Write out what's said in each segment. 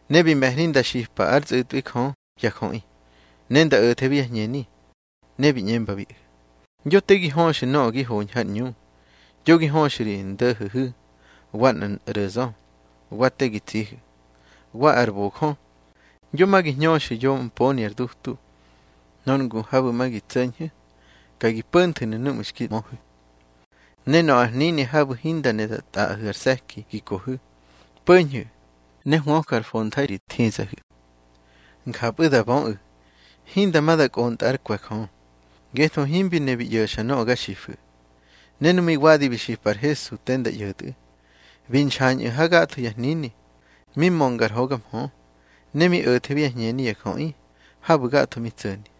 Ne bi me̱hni nda xipa ár tsꞌu̱tꞌwi Jö ya jöꞌi, ne nda o̱thebi yá hñeni. Ne bi ꞌñembabiꞌu̱: —Yo te gi höxu̱ nöꞌö gi hoñhu̱ har ꞌñu. Yo gi höxu̱ ri ndo̱ho̱hu̱, wa nꞌar ꞌro̱zö, wa te gi tsihu̱, wa ar bojö, yo ma gi hñöxu̱ yo mponi ar dutu. Nor ngu habu̱ ma gi tso̱ñhu̱, ka gi po̱nthu̱nu̱ núꞌmu̱ xki möhu̱. Ne nöꞌö ar hnini habu̱ hinda ne da tꞌaꞌahu̱ ar se̱ki gi kohu̱, po̱ñhu̱, ne hwöju̱ ár fontha̱i ri thizahu̱. Njapꞌu da böꞌu̱ hinda ma da kꞌontꞌa ár kwe̱ Jö, ngetho himbi ne bi ꞌyo̱xa nöꞌö ga xifu̱. Ne nu mi wadi bi xipa ar Hesu te nda ꞌyo̱tꞌu̱, bi nxañꞌu̱ ha gatho ya hnini, mi mönga ar hoga mhö, ne mi o̱thebi yá hñeni ya jöꞌi habu̱ gatho mi tso̱ni.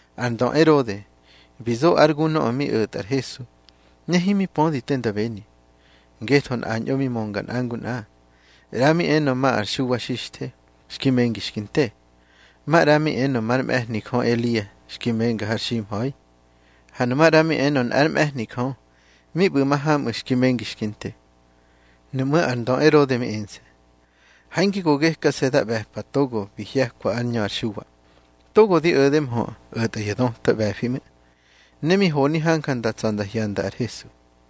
Ar ndö Erode bi zo ár gu nöꞌö mi o̱tꞌa ar Hesu, ne himi pödi te nda beni, ngetho nꞌañꞌo mi mönga nꞌa ngu nꞌa. ꞌRa mi enö ma ar Xuwa Xixthe xki mengi xki nte. Maꞌra mi enö már mꞌe̱hni Jö Elia xki menga har ximha̱i. Ha nu maꞌra mi enö nꞌár mꞌe̱hni Jö mi ꞌbu̱ mahamꞌu̱ xki mengi xki nte. Nuꞌmú̱ ar ndö Erode mi ense̱: —Ha hinge go gekase̱ da ꞌbe̱pa togo bi hye̱kwa ár ñö ar Xuwa. Togo di o̱de mhö o̱tꞌa ya döta ꞌbe̱fi ꞌmu̱. Ne mi honi hanja nda tsa̱ nda hyanda ar Hesu.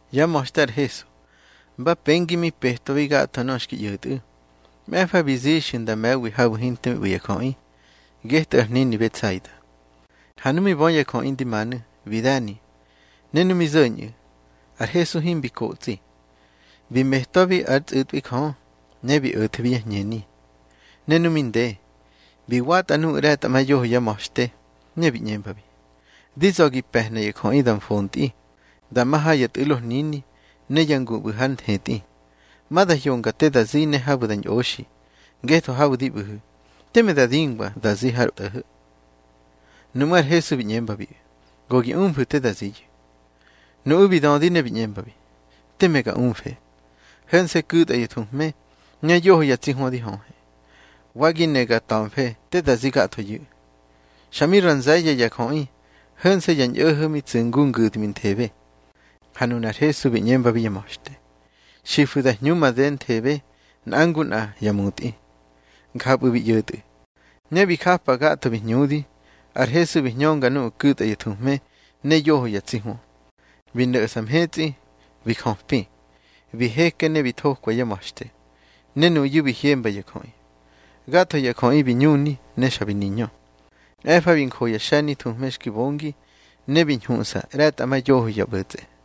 Yá ma̱xte ar Hesu mba pengi mi petwabi gatho nöꞌö xki ꞌyo̱tꞌu̱. Mꞌe̱fa bi zixyu̱ nda me̱wi habu̱ hinte mi ꞌbu̱ ya jöꞌi, getꞌu̱ ar hnini Betsaida. Ha nu mi bö ya jöꞌi ndi manu̱, bi de̱ni. Ne nu mi zo̱ñꞌu̱, ar Hesu himbi kotsꞌi, bi metwabi ár tsꞌu̱tꞌwi Jö, ne bi o̱thebi yá hñeni. Nu mi nde, bi watꞌa nuꞌu̱ ꞌre̱tꞌamayoho yá ma̱xte, ne bi ꞌñembabi: —Di za̱ gi pe̱hna ya jöꞌi da mfontꞌi, da ma ha ya tꞌu̱lo hnini ne ya ngu ꞌbu̱ har nthetꞌi, ma da hyonga te da zi ne habu̱ da ñꞌoxi. Ngetho habu̱ di ꞌbu̱hu̱, teme da dingwa te da zi har tꞌo̱ho̱. Nuꞌmú̱ ar Hesu bi ꞌñembabiꞌu̱: —Go gi umfu̱ te da ziyu̱. Nuꞌu̱ bi dödi ne bi ꞌñembabi: —Teme ga umfe. Ho̱nse̱ ku̱tꞌa ya thuhme ne yoho ya tsi hwö di höhe. Wa gi ne ga ta̱mfe te da zi gathoyu̱. Xa mi ra nze̱ye̱ ya jöꞌi, ho̱nse̱ ya ñꞌo̱ho̱ mi tsu̱ ngu ngu̱dminthebe. Ha nunar Hesu bi ꞌñembabi yá ma̱xte: —Xifu̱ da hñu madenthebe nꞌa ngu nꞌa ya mutꞌi. Njapꞌu̱ bi ꞌyo̱tꞌu̱, ne bi japa gatho bi hñudi. Ar Hesu bi hñönga nuꞌu̱ ku̱tꞌa ya thuhme ne yoho ya tsi hwö, bi no̱ꞌsa mhetsꞌi, bi jöpi. Bi heke ne bi thokwa yá ma̱xte, ne nuyu̱ bi hyemba ya jöꞌi. Gatho ya jöꞌi bi ñuni ne xa bi niñö. Mꞌe̱fa bi njo ya xe̱ni thuhme xki bongi, ne bi ñhuꞌsa ꞌre̱tꞌamayoho ya ꞌbo̱tsꞌe.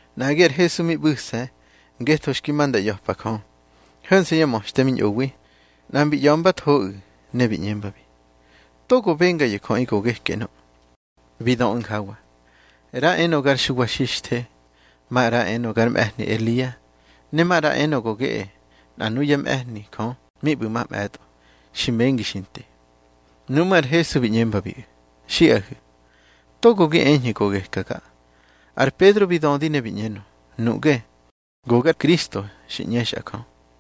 Nꞌagi ar Hesu mi ꞌbu̱se̱ ngetho xki ma nda ꞌya̱pa Jö, ho̱nse̱ yá ma̱xte mi ñꞌowi. Nꞌa mbi ꞌya̱mbathoꞌu̱, ne bi ꞌñembabi: —Togo benga ya jöꞌi go geke ꞌnö. Bi döꞌu̱ njawa: —ꞌRa enö gar Xuwa Xixthe, maꞌra enö gar mꞌe̱hni Elia, ne maꞌra enö go geꞌe nꞌa nuyá mꞌe̱hni Jö mi ꞌbu̱ mamꞌe̱tꞌo, xi mengi xi nte. Nuꞌmú̱ ar Hesu bi ꞌñembabiꞌu̱: —Xiꞌahu̱, togo gi eñhu̱ go gekaga. Ar Pedro bi dödi, ne bi ꞌñenö: —Nuꞌge go gar Kristo xi ꞌñexꞌa Jö.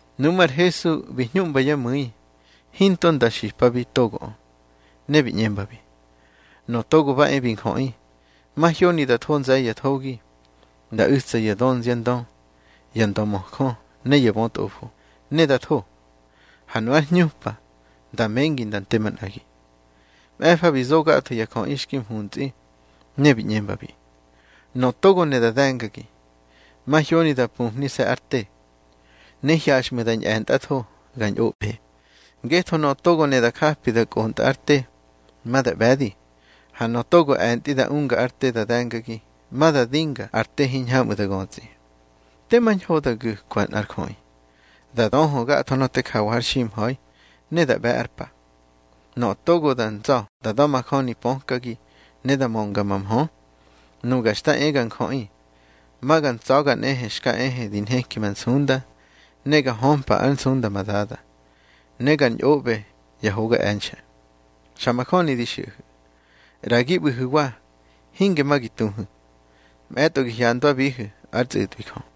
Nuꞌmú̱ ar Hesu bi hñuꞌmba yá mu̱i hinto nda xipabi togoꞌö. Ne bi ꞌñembabi: —Nöꞌö Togo ba e bi Njöꞌi, mahyoni nda tho nze̱ye̱ ya thogi. Nda u̱tsa ya dönziandö, ya ndömöjö ne ya bötꞌofo, ne nda tho. Ha nu ár hñupa nda mengi nda nte manꞌagi. Mꞌe̱fa bi zo gatho ya jöꞌi xki mhuntsꞌi, ne bi ꞌñembabi: —Nöꞌö togo ne da de̱ngagi, mahyoni da pumhnise̱ ár te, ne hyaxꞌmu̱ da ñꞌe̱ntꞌatho ga ñꞌoꞌbe. Ngetho nöꞌö togo ne da japi da kꞌontꞌa ár te, ma da ꞌbe̱di. Ha nöꞌö togo e̱ntꞌi da unga ár te da de̱ngagi, ma da dinga ar te hiñhamꞌu̱ da götsꞌi. Tema ñho da gu̱kwa nꞌar jöꞌi, da döhö gatho nöꞌö te jawa har ximha̱i, ne da ꞌbe̱ ár pa. Nöꞌö togo da ntsa̱ da da̱majöni pökagi ne da mönga ma mhö, Nuga Xta e ga Njöꞌi ma ga ntsa̱ga nꞌehe xka ehe di nheki ma nsunda, ne ga hömpa ár nsunda ma Dada, ne gar ñꞌoꞌbe ya hoga e̱nxe̱. Xa majöni di xiꞌahu̱, ꞌra gi ꞌbu̱hu̱wa hinge ma gi tuhu̱, mꞌe̱tꞌo gi hyandwabihu̱ ár tsꞌu̱tꞌwi Jö.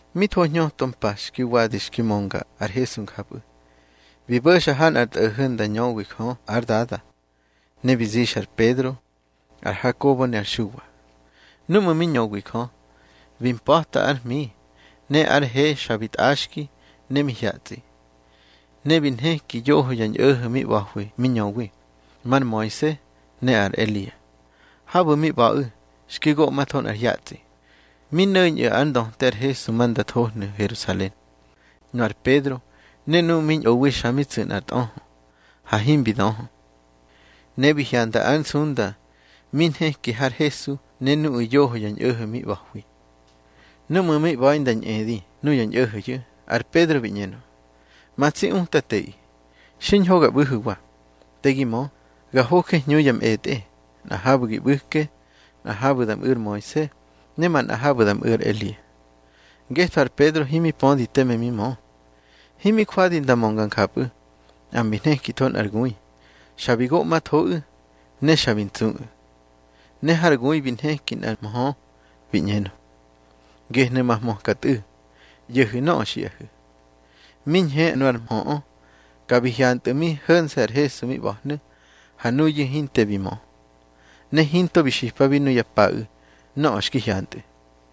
Mi tho ñhöto mpa xki wadi xki mönga ar Hesu njapꞌu̱, bi bo̱xa ha nꞌar tꞌo̱ho̱ nda ñöwi Jö ár Dada, ne bi zixa ar Pedro, ar Hakobo ne ar Xuwa. Núꞌmu̱ mi ñöwi Jö, bi mpa̱ta ár hmi, ne ár he xa bi tꞌaxki ne mi hyatsꞌi. Ne bi nhekinu̱ yoho ya ñꞌo̱ho̱ mi ꞌba̱hwi mi ñöwi, mar Moise ne ar Elia. Habu̱ mi ꞌba̱ꞌu̱ xki goꞌmatho nꞌar hyatsꞌi. Mi no̱ñꞌu̱ ár ndöte ar Hesu ma nda thohnu̱ Herusalen. Nu ar Pedro ne nuꞌu̱ mi ñꞌowi xa mi tsu̱ nꞌar tꞌöhö, ha himbi döhö. Ne bi hyanda ar nsunda mi nheki har Hesu ne nuꞌu̱ yoho ya ñꞌo̱ho̱ mi ꞌba̱hwi. Núꞌmu̱ mi ꞌba̱i nda ñꞌedi nuya ñꞌo̱ho̱yu̱, ar Pedro bi ꞌñenö: —Ma tsi Utateꞌi, xiñho ga ꞌbu̱hu̱wa. Te gi mö, ga hoje hñu ya mꞌetꞌe, nꞌa habu̱ gi ꞌbu̱ke, nꞌa habu̱ da mꞌu̱ ar Moise, ne manꞌa habu̱ da mꞌu̱ ar Elia. Ngetho ar Pedro himi pödi teme mi mö. Himi jwadi nda mönga njapꞌu̱, nꞌa mbi nhekitho nꞌar gui, xa bi goꞌmathoꞌu̱, ne xa bi ntsuꞌu̱. Ne har gui bi nheki nꞌar mhö, bi ꞌñenö: —Gehnu̱ ma hmöka Tꞌu̱. ꞌYo̱hu̱ nöꞌö xiꞌahu̱. Mi ñhe nu ar mhöꞌö, ka bi hyantꞌu̱ mi ho̱nse̱ ar Hesu mi ꞌba̱hnu̱. Ha nuyu̱ hinte bi mö, ne hinto bi xipabi nuya paꞌu̱ nöꞌö xki hyantꞌu̱.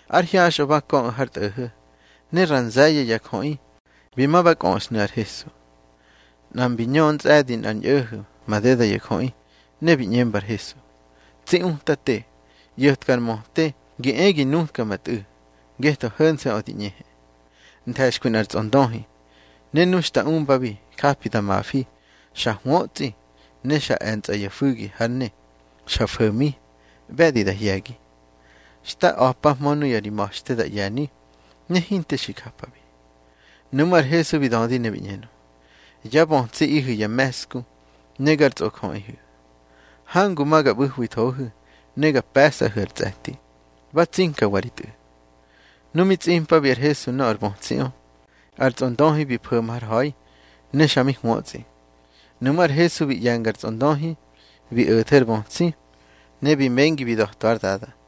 Ár hyaxꞌö ba köꞌu̱ har tꞌo̱ho̱, ne ra nze̱ye̱ ya jöꞌi bi ma ba kꞌöꞌsnu̱ ar Hesu. Nꞌa mbi ñö ntsꞌe̱di nꞌar ñꞌo̱ho̱ madeda ya jöꞌi, ne bi ꞌñemba ar Hesu: —Tsi Utate, ꞌyo̱tka ar möte gi e gi nutka ma tꞌu̱, ngetho ho̱nse̱ꞌö di ꞌñehe. Nthe̱xkwi nꞌar tsꞌondöhi, ne nu xta umbabi japi da mafi. Xa hwötsꞌi, ne xa e̱ntsꞌa ya fu̱gi hár ne. Xa fo̱mi, ꞌbe̱di da hye̱gi. Xta a̱pahmö nuya ri ma̱xte da ꞌye̱ni, ne hinte xi japabi. Nuꞌmú̱ ar Hesu bi dödi ne bi ꞌñenö: —Yá bötsiꞌihu̱ ya me̱ꞌsku ne gar tsꞌojöꞌihu̱. Hangu ma ga ꞌbu̱hwithohu̱ ne ga pe̱sꞌahu̱ ar tsꞌe̱ti. Ba tsinkawa ri tꞌu̱. Nu mi tsꞌimpabi ar Hesu nöꞌö ar bötsiꞌö, ar tsꞌondöhi bi fo̱ma har ha̱i, ne xa mi hwötsꞌi. Nuꞌmú̱ ar Hesu bi ꞌye̱nga ar tsꞌondöhi, bi o̱the ar bötsi, ne bi mengi bi da̱twa ár dada.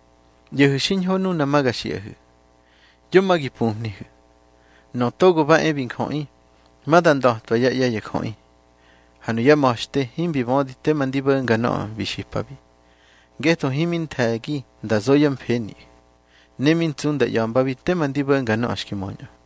—ꞌYo̱hu̱ xiñho nuna ma ga xiꞌahu̱, yo ma gi pumhnihu̱: Nöꞌö Togo ba e bi Njöꞌi, ma da nda̱twa yá ꞌye̱ ya jöꞌi. Ha nuyá ma̱xte himbi bödi tema ndi bo̱nga nöꞌö bi xipabi, ngetho himi nthe̱gi nda zo yá mfeniꞌu̱. Ne mi ntsu nda ꞌya̱mbabi tema ndi bo̱nga nöꞌö xki möñꞌö.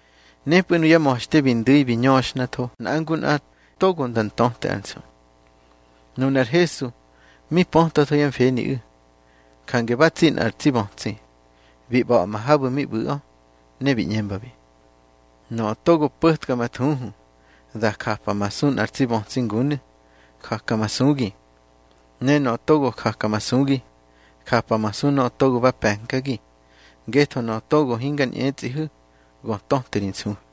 Nepꞌu̱ nuyá ma̱xte bi ndu̱i bi ñöxhnatho nꞌa ngu nꞌa togo nda ntöte ár nsu. Nunar Hesu mi pötwatho yá mfeniꞌu̱. Jange ba tsi nꞌar tsi bötsi, bi ꞌba̱ꞌma habu̱ mi ꞌbu̱ꞌö. Ne bi ꞌñembabiꞌu̱: —Nöꞌö togo po̱tka ma thuhu da japamasu nꞌar tsi bötsi ngunu̱, jakamasugi. Ne nöꞌö togo jakamasugi, japamasu nöꞌö togo ba pe̱nkagi. Ngetho nöꞌö togo hingar ñꞌetsꞌihu̱, go töte ri nsuhu̱.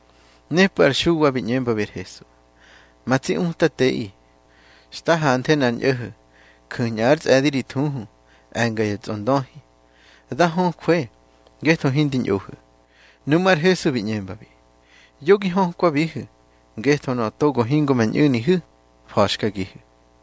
Nepꞌu̱ ar Xuwa bi ꞌñembabi ar Hesu: —Ma tsi Utateꞌi, xta hanthe nꞌar ñꞌo̱ho̱ ju̱ñꞌa ár tsꞌe̱di ri thuhu, e̱nga ya tsꞌondöhi. Da höjwe ngetho hindi ñꞌohu̱. Nuꞌmú̱ ar Hesu bi ꞌñembabi: —Yo gi hökwabihu̱, ngetho nöꞌö togo hingo ma ñꞌu̱nihu̱, fa̱xkagihu̱.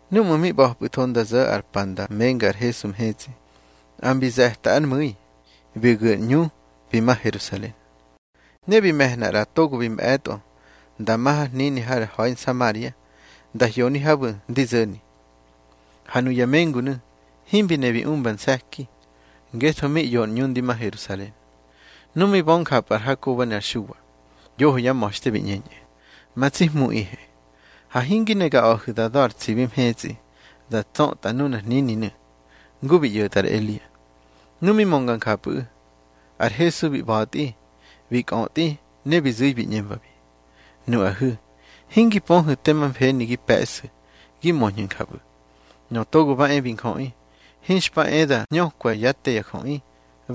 Núꞌmu̱ mi ꞌba̱pꞌu̱tho nda zo̱ ar pa nda menga ar Hesu mhetsꞌi, nꞌa mbi ze̱ta ár mu̱i, bi gu̱ ar ꞌñu bi ma Herusalen. Ne bi me̱hna ꞌra togo bi mꞌe̱tꞌo nda ma ha nꞌar hnini har ha̱i Nsamaria, nda hyoni habu̱ ndi zo̱ni. Ha nuya mengunu̱ himbi ne bi umba nse̱ki, ngetho mi ꞌyo ar ꞌñu ndi ma Herusalen. Nu mi bö njapꞌu̱ ar Hakobo ne ar Xuwa, yoho yá ma̱xte, bi ꞌñeñꞌu̱: —Ma tsi Hmuꞌihe, ha hingi ne ga a̱hu̱ da da̱ ar tsibi mhetsꞌi, da tsötꞌa nunar hnininu̱, ngu bi ꞌyo̱tꞌa ar Elia. Nu mi mönga njapꞌu̱ꞌu̱, ar Hesu bi ꞌba̱tꞌi bi kꞌötꞌi, ne bi zu̱i bi ꞌñembabi: —Nuꞌahu̱, hingi pöhu̱ tema mfeni gi pe̱ꞌsu̱ gi möñhu̱ njapꞌu̱. Nöꞌö Togo ba e bi Njöꞌi, hinxpa e da hñökwa yá te ya jöꞌi,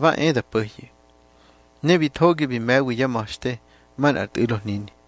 ba e da po̱hyu̱. Ne bi thogi bi me̱wi yá ma̱xte manꞌar tꞌu̱lo hnini.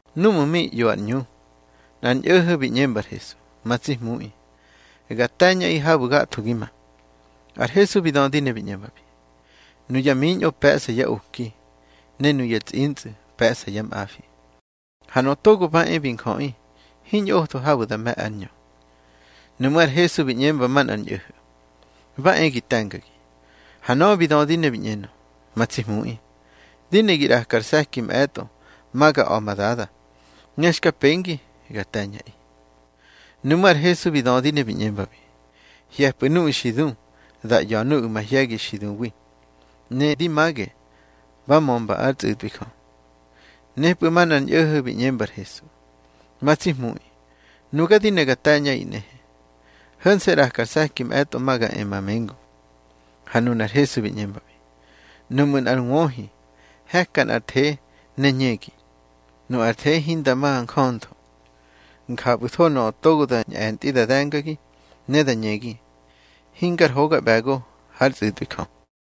Núꞌmu̱ mi ꞌyo ar ꞌñu, nꞌar ñꞌo̱ho̱ bi ꞌñemba ar Hesu: —Ma tsi Hmuꞌi, ga te̱ñꞌaꞌi habu̱ gatho gi ma. Ar Hesu bi dödi ne bi ꞌñembabi: —Nuya miñꞌo pe̱ꞌsa yá oki, ne nuya tsꞌintsꞌu̱ pe̱ꞌsa yá mꞌafi, ha Nöꞌö Togo ba e bi Njöꞌi hiñꞌotho habu̱ da me̱ ár ñö. Nuꞌmú̱ ar Hesu bi ꞌñemba manꞌar ñꞌo̱ho̱: —Ba e gi te̱ngagi. Ha nöꞌö bi dödi ne bi ꞌñenö: —Ma tsi Hmuꞌi, di ne gi ꞌraka ar se̱ki mꞌe̱tꞌo ma ga a̱ ma dada, ne xka pengi ga te̱ñꞌaꞌi. Nuꞌmú̱ ar Hesu bi dödi ne bi ꞌñembabi: —Hye̱pꞌu̱ nuꞌu̱ xi du da ꞌya̱ nuꞌu̱ mahye̱gi xi duwi. Ne di mage ba mömba ár tsꞌu̱tꞌwi Jö. Nepꞌu̱ manꞌar ñꞌo̱ho̱ bi ꞌñemba ar Hesu: —Ma tsi Hmuꞌi, nuga di ne ga te̱ñꞌaꞌi nꞌehe. Ho̱nse̱ ꞌraka ar se̱ki mꞌe̱tꞌo ma ga e ma mengu. Ha nunar Hesu bi ꞌñembabi: —Nuꞌmu̱ nꞌar wöhi he̱ka nꞌar the ne ñegi, nu ar the hinda ma njöntho. Njapꞌu̱tho nöꞌö togo da ñꞌe̱ntꞌi da de̱ngagi, ne da ñegi, hingar hoga ꞌbe̱go hár tsꞌu̱tꞌwi Jö.